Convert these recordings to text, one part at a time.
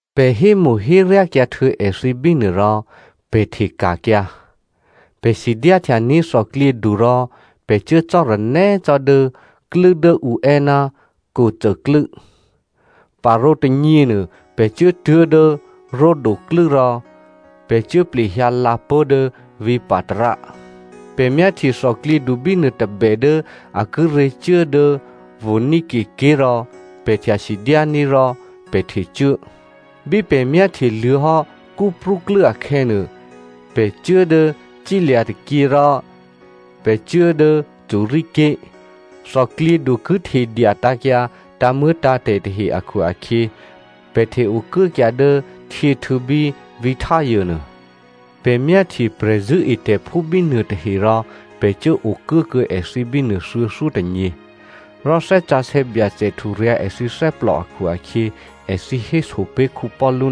Pè̤ hémo̤héryákyǎhtuô̌ èthǐ bínuô rò pè̤ hteka̤kyǎ. Pè̤ sidyáhtyaní̤ thòklyědu rò pè̤ cuố cò́ranè́ cò́ dố klû́ dố ǔ è́ ná Co klû́. Parǒ tônyěnuô pè̤ cuốtuố̤ dố Rhode klû́ rò pè̤ cuố plehyǎ lǎpó̤ dố vǐ̤ Patara. Pè̤ myáhtye thòklyědu bínuô tôbè dố a kíré̤ cuố dố Phonicia ké̤ rò pè̤ htya sidyání̤ rò pè̤ htecuố. Bí pè̤ myáhtyeluô̌hò́ Cyprú klû́ akhè̌nuô, pè̤ cuố dố cílya̤ tôkyě rò pè̤ cuố dố Syria ké̤. Thòklyědu ki htedya tǎ̤kyǎ tǎ̤muô̌tǎ̤tè̤ tahe akhu-akhyě, pè̤ hte-okuốkyǎ dố htyěhtû̌ bí vǐ̤ Tyre nuô. Pè̤ myáhtye prè̤zṳ̂́etè̤phú bínuô tahe rò pè̤ cuố okuốkuô̌ èthǐ bínuô thuô̌thyótônyě. Rò Thè́ Sǎsè̌ Byacè hturyǎ̤ èthǐ thè́plò akhu-akhyě, èthǐ héso pé̤ Paulu,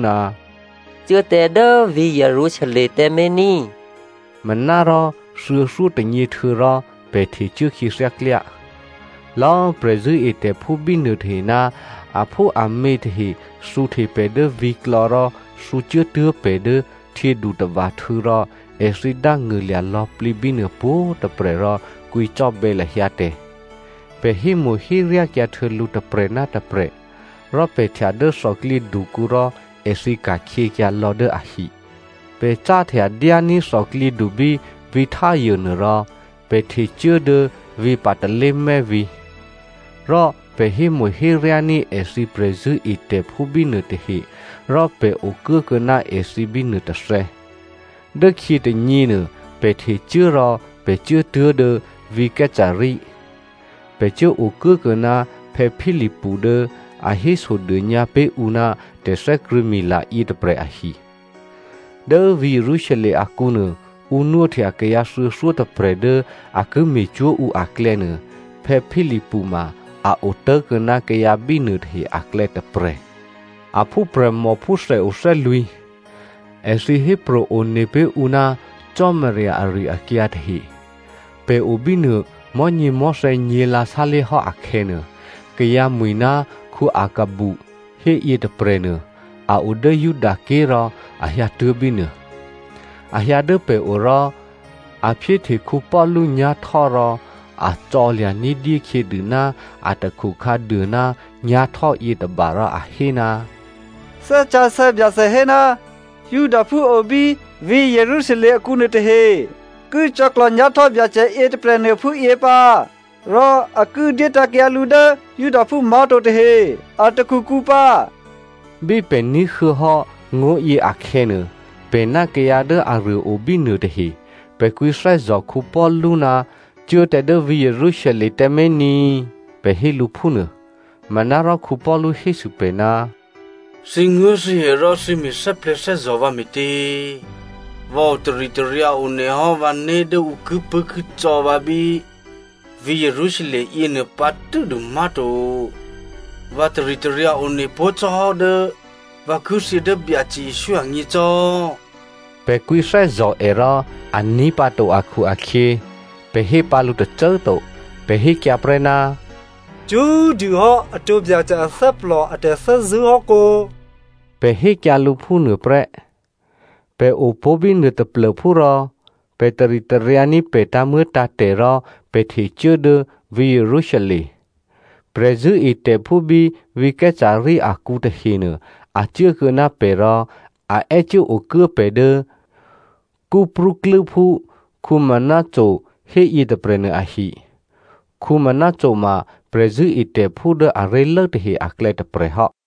“Cuố tǎ dố vǐ̤ Jerusalem tǎmé̤ ní꤮.” Manárò thuô̌thyótônyě htuô̌rò pè̤ htecuố khyěthyá klyá. Lò̌꤮ prè̤zṳ̂́etè̤phú bínuô tahe ná aphúamě tahe thǔhte pè̤ dố vǐ̤klò̌ rò thǔcuốtuố̤ pè̤ dố htyědutava̤htû̌ rò èthǐ dángṳ̂lya̤ lò̌plǐ bínuô pwǒ̤꤮ tôprè̤ rò kwǐcò́bè̌ lahyǎ tè̤. Pè̤ hémo̤héryákyǎ htuô̌ lǔ tôprè̤ ná tôprè̤, rò pè̤ htya dố thòklyědukǔ rò èthǐ ka̤khyěkyǎ lò̌ dố ahi. Pè̤ cáhtya dyání̤ thòklyědu bí vǐ̤ Tyre nuôrò pè̤ htecuố dố vǐ̤ Ptolemais vǐ̤. Rò pè̤ hémo̤héryání̤ èthǐ prè̤zṳ̂́etè̤phú bínuôtahe rò pè̤ okuốkuô̌ ná èthǐ bínuô tôthè̌. Dốkhyě tônyěnuô, pè̤ htecuố rò pè̤ cuốtuố̤ dố vǐ̤ Caesarea. Pè̤ cuố okuốkuô̌ ná Philipu dố a hésodônyǎ pé̤ ǔ ná tè̤thè́krṳ̂̌mila yětôprè̤ ahi. Dố vǐ̤ Jerusalem akǔ nuô, ǔ nwóhtya kayǎ thuô̌thyótôprè̤ dố a ki me̤cwó̤ ǔ aklè̌nuô, Philipu ma a otố̤kuô̌ ná kayǎ bínuô tahe aklè̌ tôprè̤. A phúprè̤mò phúthèo thè́lwǐ̤. Èthǐ hépro̤ one pé̤ ǔ ná Cò́marya ari-akyǎ tahe. Pè̤ o bínuô, mò̤́nyěmò̤́thè̌ nyě̤lǎ sálé̤hò́ akhè̌nuô, kayǎ mwi̤ ná Aghabu héyě tôprè̤nuô a o dố Judaké̤ rò a hyǎtuố̤ bínuô. A hyǎ dố pè̤o rò a phyéhte Paulu nyá̤htò́ rò a cò̌lya̤ ní̤dyé khyědû ná atakhu khǎduô ná nyá̤htò́ yětôba rò a hé, “Thè́ Sǎsè̌ Byacè hé, ‘Judaphú o bí vǐ̤ Jerusalem akǔ nuôtahe ki cò̌klò̤ nyá̤htò́ Byacè yětôprè̤nuô phúyě pǎ rò a ki dyétǎ̤kyǎ lǔ dố Judaphú má̤to tahe a takhukǔ pǎ.’” Bí pè̤ ní̤huô̌ hò́ ngó̤yě akhè̌nuô, pè̤ ná kayǎ dố aruô obínuô tahe, pè̤ kwǐthè́zò̤ Paulu ná cuố tǎ dố vǐ̤ Jerusalem tǎmé̤ ní꤮ pè̤ hé lǔ phúnuô. Manárò Paulu hésû pè̤, “Thǐnguố̤thǐhè rò thǐ me̤ thè́plè̤̌thè́zò̤ vǎ me̤tě? Vǎ otaritaryǎ one hò́ vǎné̤ dố ǔ kipṳ̂́kicò̌ vǎ bí vǐ̤ Jerusalem yěnuô pǎ tû́dû má̤to, vǎ taritaryǎ one pó̤ cò́hò́ dố vǎ ki thyě dố Byacè Jesǔ agně cò́.” Pè̤ kwǐthè́zò̤ è rò a ní̤pǎto akhu-akhyě, pè̤ hé pǎ lǔ tôcô꤮ to, pè̤ hékyǎ prè́, “Cṳ́꤮ dûhò́ atǒ Byacè athè́plò a tè̤thè́zṳ̂́ hò́ kǒ?” Pè̤ hékyǎ lǔ phúnuô prè́. Pè̤ opó̤ bínuô taplô̤phú rò, pè̤ taritaryǎní̤ pè̤ tǎ̤muô̌tǎ̤tè̤ rò pè̤ htecuố dố vǐ̤ Jerusalem. Prè̤zṳ̂́etè̤phú bí vǐ̤ Caesarea akǔ tahenuô a cuốkuô̌ ná pè̤ rò a è́cuố okuố pè̤ dố Cyprúklû́phú Maso hé yětôprè̤nuô ahi. Maso ma prè̤zṳ̂́etè̤phú dố aré̤lố tahe aklè̌ tôprè̤ hò́.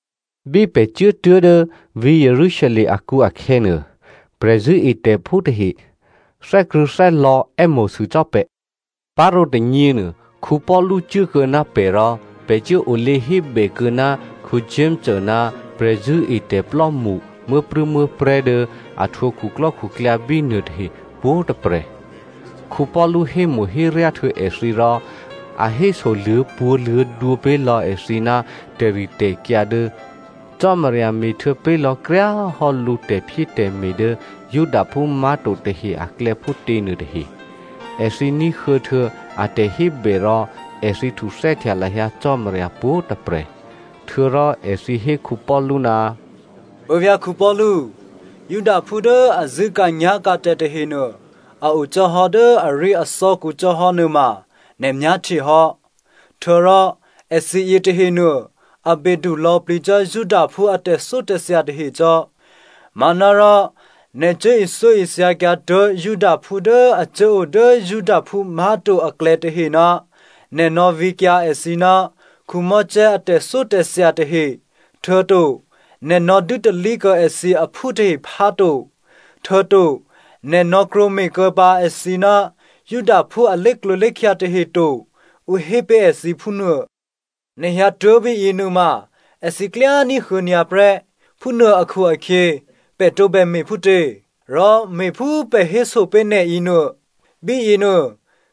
Bí pè̤ cuốtuố̤ dố vǐ̤ Jerusalem akǔ akhè̌nuô, prè̤zṳ̂́etè̤phú tahe thè́krṳ̂̌thè́lò̌ è́mo̤sû cò́ pè̤. Parǒ tônyěnuô, Paulu cuốkuô̌ ná pè̤ rò pè̤ cuốolě hébèkuô̌ ná Jakomo ná prè̤zṳ̂́etè̤plò́mṳ muố̤prû̌muố̤prè̤́ dố a htwǒ khuklò́khuklyǎ bínuôtahe pwǒ̤꤮ tôprè̤. Paulu hémo̤héryá htuô̌ èthǐ rò, a héso luô̌pwǒ̤luô̌dwǒ pé̤ lò̌ èthǐ ná tè̤ritè̤kyǎ dố Cò́marya me̤htuô̌ pé̤ lò̌kryá꤮ hò́ lǔ tè̤phyétè̤me̤ dố Judaphú má̤to tahe aklè̌ phútě nuôtahe. Èthǐ ní̤huô̌htuô̌ a tè̤hébè rò, èthǐ htuthè́htya lahyǎ Cò́marya pwǒ̤꤮ tôprè̤. Htuô̌rò èthǐ hé Paulu, “Puố̤vyá̤ Paulu꤮, Judaphú dố a zṳ̂́ka̤nyá̤ka̤tè̤ tahenuô a o cò́hò́ dố aríathò́kǔ cò́ hò́ nuôma, nè̤ myáhtye hò́. Htuô̌rò èthǐ yětahenuô a bedu lò̌plǐ cò́ Judaphú a tè̤thyótè̤thya tahecò́. Manárò nè̤ cuố ithyóithyakyǎ tuố̤ Judaphú dố a cuốo dố Judaphú má̤to aklè̌ tahe ná nè̤ nò̌ vǐkyǎ èthǐ ná Mosè a tè̤thyótè̤thya tahe, htuô̌to nè̤ nò̌ dû́talí kuô̌ èthǐ aphú tahe phá to, htuô̌to nè̤ nò̌ krwǒme̤ kuô̌pǎ èthǐ ná Judaphú a lé̤klǒlé̤khya tahe to, ǔ hé pé̤ èthǐ phúnuô. Nè̤ hyǎtuố̤ bíyě nuôma, èthǐ klyá꤮ ní̤huô̌ nyǎ prè́. Phúnuô akhu-akhyě, pè̤ tǒbè me̤phútě? Rò me̤phú pè̤ héso pé̤ nè̤ yěnuô. Bíyěnuô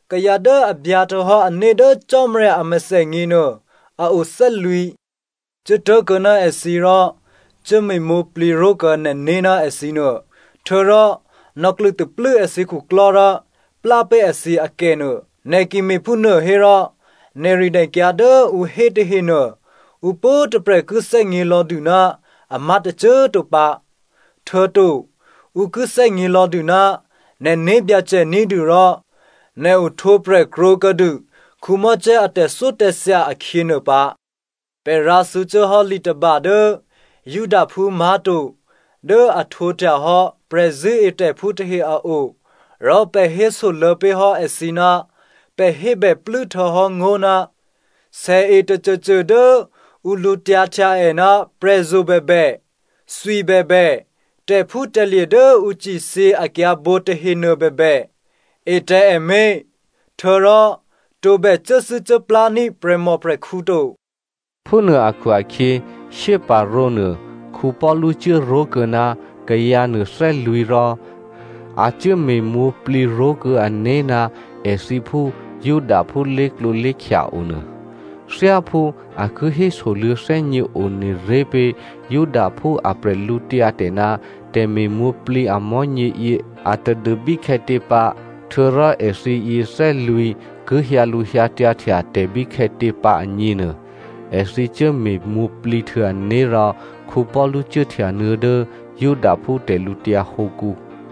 kayǎ dố a byǎhtuô̌hò́ ané̤ dố Cò́marya a mèthènyěnuô, a o thè́lwǐ̤. Cuố tố̤kuô̌ ná èthǐ rò cuốme̤mwǒ̤plǐ ró̤kuô̌ nè̤né̤ ná èthǐ nuô. Htuô̌rò nò̌klṳ̂taplû́ èthǐ khuklò́ rò plá pé̤ èthǐ akènuô. Nè̤ ki me̤phúnuô hérò nè̤rinè̤kyǎ dố ǔ hé tahenuô ǔ pwǒ̤꤮ tôprè̤ ki thè́gně lò̌dû ná amá̤ tôcô꤮ to pǎ. Htuô̌to ǔ ki thè́gně lò̌dû ná nè̤ né̤byacè ní̤dû rò nè̤ ohtwǒprè̤ krwǒkuô̌dû Mosè a tè̤thyótè̤thya akhyěnuô pǎ. Pè̤ rǎthǔcuốhò́ li tôba dố Judaphú má̤to dố a htwǒhtyahò́ prè̤zṳ̂́etè̤phú tahe a o rò pè̤ hésoluô̌ pé̤ hò́ èthǐ ná pè̤ hébèplû́ htuô̌hò́ ngó̤ ná sèe tôcôcô dố ǔ lǔtyǎhtya è ná prè̤zo̤ bèbè, thwi bèbè, tè̤phútè̤lye̤ dố ǔ cithyě akyǎ̤bǒ tahenuô bèbè, e tǎ è mé̤, htuô̌rò tǒbè cuốthû́cuốplání̤ prè̤mòprè̤khǔ to.” Phúnuô akhu-akhyě, shyéparǒnuô Paulu cuốró̤kuô̌ ná kayǎnuô thè́lwǐ̤ rò a cuốme̤mwǒ̤plǐ ró̤kuô̌ ané̤ ná èthǐ phú Judaphú lé̤klǒlé̤khya onuô. Thyáphú a ki hésoluô̌ thè́gně one ré̤ pé̤ Judaphú a bwídu ná tè̤me̤mwǒ̤plǐ a mò̤́nyěyě atadû bíkhè̌tě pǎ, htuô̌rò èthǐyě thè́lwǐ̤ ki hyǎlǔhyǎtyǎhtya tè̤ bíkhè̌tě pǎ agněnuô, èthǐ cuốme̤mwǒ̤plǐ htuô̌ ané̤ rò Paulu cuốhtyanuô̌ dố Judaphú tè̤lǔtyǎ hǒkǔ.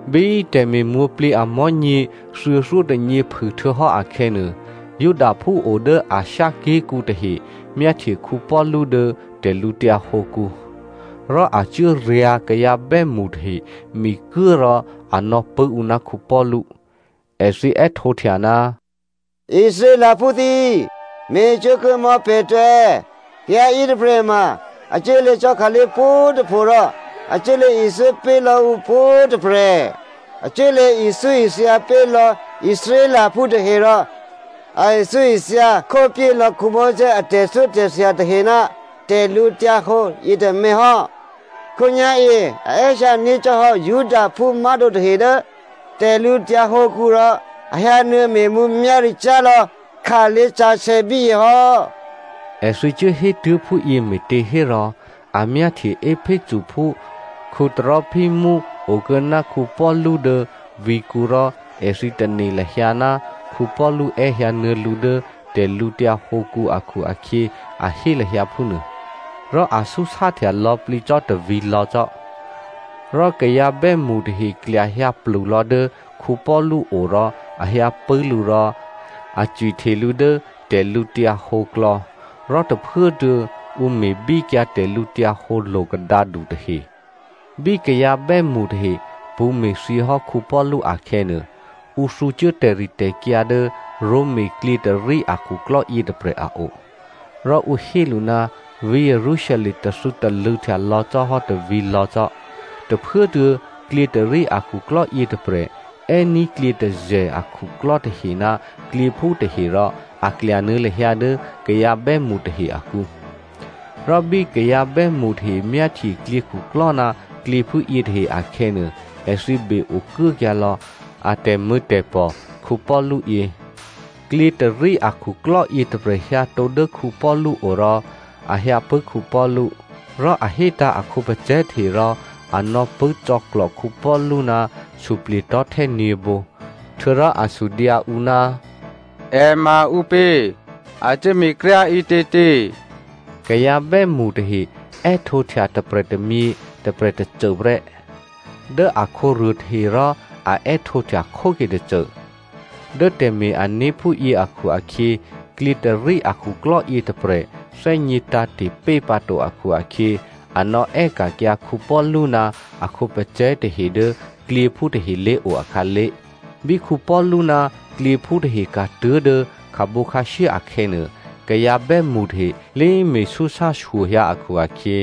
Bí tè̤me̤mwǒ̤plǐ amò̤́nyě thuô̌thyótônyě phûhtuô̌hò́ akhè̌nuô, Judaphú o dố Asia ké̤kǔ tahe myáhtye Paulu dố tè̤lǔtyǎ hǒkǔ, rò a cuốryǎ̤ kayǎ bè́mṳ tahe mikuố rò a nò̌pṳ̂́ ǔ ná Paulu. Èthǐ è́htǒhtya, “Israelphú thǐ꤮, me̤cwó̤ kuô̌ mò̌ pè̤ tǎ! Kayǎ yětôprè̤ ma, a cuốlě cò́ khǎlé̤ pwǒ̤꤮ tôpho rò a cuốlě ithyó pé̤ lò̌ ǔ pwǒ̤꤮ tôprè̤. A cuốlě ithyóithya pé̤ lò̌ Israelphú tahe rò a ithyóithya khópyé lò̌ Mosè a tè̤thyótè̤thya tahe ná tè̤lǔhǒdu yětômě hò́. Khǒnyá̤yě, a è́hyǎ ní̤cò́hò́ Judaphú má̤to tahe dố tè̤lǔtyǎ hǒkǔ rò a hyǎnuô̌ me̤ mǔmyá̤ricyá̤ lò̌ khǎlé̤ sǎsè̌ bíyě hò́.” (Èthǐ cuốhétuố̤ phúyě me̤těhérò a myáhtye Ephesophú Trophimo okuô̌ ná Paulu dố vǐ̤kǔ rò èthǐ tane̤ lahyǎ ná Paulu è́hyǎ nuô̌ lǔ dố tè̤lǔtyǎ hǒkǔ akhu-akhyě a hé lahyǎ phúnuô.) Rò a súsáhtya lò̌plǐ cò́ tôvǐ̤lò̌ cò́. Rò kayǎ bè́mṳ tahe klyahyǎ plulò̌ dố Paulu o rò a hyǎpṳ̂́ lǔ rò a cwihte lǔ dố tè̤lǔhǒduklò̌, rò tôphuốtuô̌ ǔ me̤bíkyǎ tè̤lǔhǒdu lo̤kadǎdu tahe. Bí kayǎ bè́mṳ tahe pṳ̌me̤thyěhò́ Paulu akhè̌nuô, ǔ thǔcuố tè̤ritè̤kyǎ dố Roma klyětôrí akhuklò́ yětôprè̤ a o, rò ǔ hé lǔ ná vǐ̤ Jerusalem tathû̌talṳ̂̌htya lò̌ cò́hò́ tôvǐ̤lò̌ cò́. Tôphuốtuô̌ klyětôrí akhuklò́ yětôprè̤ è́ní̤ klyětôzè̤ akhuklò́ tahe ná klyěphú tahe rò a klyanuô̌ lahyǎ dố kayǎ bè́mṳ tahe akǔ, rò bí kayǎ bè́mṳ tahe myáhtye klyěkhuklò́ ná klyěphú yětahe akhè̌nuô, èthǐ be-okuốkyǎ lò̌ a tè̤mṳ̂̌tè̤pò̤ Paulu yě. Klyětôrí akhuklò́ yětôprè̤ hyǎtǒ dố Paulu o rò a hyǎpṳ̂́ Paulu. Rò a hétǎ̤ a khǒpacè̤̌ tahe rò a nò̌pṳ̂́ cò̌klò̤ Paulu ná suplye̤tò̤́htè́ nyě̤bǒ. Htuô̌rò a sudyǎ ǔ, “È ma ǔpě? A cuốme̤ kryá꤮ ǐtětě?” Kayǎ bè́mṳ tahe è́htǒhtya tôprè̤ tômyě tôprè̤ tôcô prè́, dố akhǒruô tahe rò a è́htǒhtya khóke tôcô. Dố tè̤me̤-ané̤ phúyě akhu-akhyě klyětôrí akhuklò́ yětôprè̤ thè́gně tǎ̤te̤ pé̤pǎto akhu-akhyě a nò̌è́ka̤kyǎ Paulu ná a khǒpacè̤̌ tahe dố klyěphú tahe lé̤o akhǎlé̤. Bí Paulu ná klyěphú tahe ka̤tuố̤ dố kabǒ khǎshyé akhè̌nuô, kayǎ bè́mṳ tahe lé me̤súsá shyohyǎ akhu-akhyě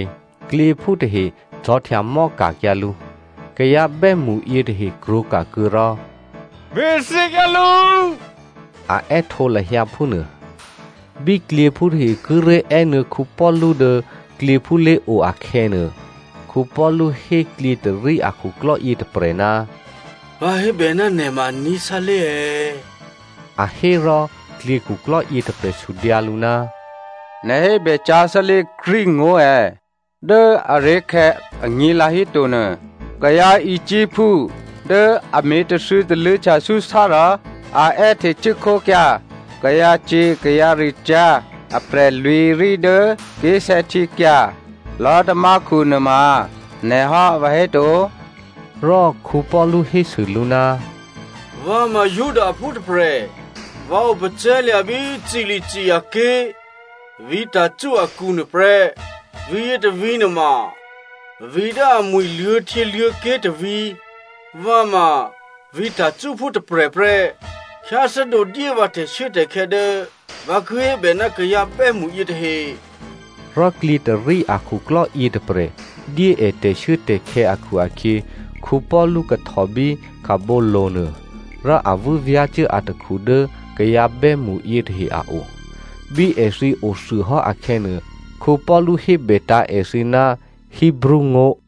klyěphú tahe cò̤̌htyamò́ ka̤kyǎ lǔ. Kayǎ bè́mṳ yětahe krwǒka̤kuô̌ rò “Me̤thyěkyǎ lǔ,” a è́htǒ lahyǎ phúnuô. Bí klyěphú tahe kíré̤ è́nuô̌ Paulu dố klyěphú lé̤o akhè̌nuô, Paulu hé klyětôrí akhuklò́ yětôprè̤, “Vǎ hébè ná nè̤ ma aní̤ sálé̤ è̌?” A hé. Rò klyěkhuklò́ yětôprè̤ sudyǎ lǔ, “Nè̤ hébècyá̤ sálé̤ Greek ngó̤ è̌? Dố aré̤khè̌ anyě̤lǎ híto nuô, kayǎ Egyptphú dố a me̤ tathû̌talṳ̂̌htya súsá rò a è́htecuốkhókyǎ kayǎcyě̤ kayǎricyá̤ aprè̤lwǐ̤rí dố ké̤sè̌htyěkya̤ lò̤́tamákhu nuôma nè̤ hò́ vǎhéto?” Rò Paulu hésû lǔ, “Vǎ ma Judaphú tôprè̤, vǎ opacè̤̌lya̤ bí Cilicia ké̤, vǐ̤ Tarso akǔ nuôprè́. Vǐ̤yě tôvǐ̤ nuôma vǐ̤ dố amwi̤ luô̌htyěluô̌ké̤ tôvǐ̤. Vǎ ma vǐ̤ Tarsophú tôprè̤ prè́. Khyáthè́dǒ dyé vǎ tè̤shuốtè̤khè̌ dố vǎ ki hébè ná kayǎ bè́mṳ yětahe.” Rò klyětôrí akhuklò́ yětôprè̤ dyé è tè̤shuốtè̤khè̌ akhu-akhyě, Paulu kahtò bí kabǒlo̤ nuô, rò a vû́vyá̤cuố atakhu dố kayǎ bè́mṳ yětahe a o. Bí èthǐ othuôhò́ akhè̌nuô, Paulu hébètǎ̤ èthǐ ná Hebreo ngó̤.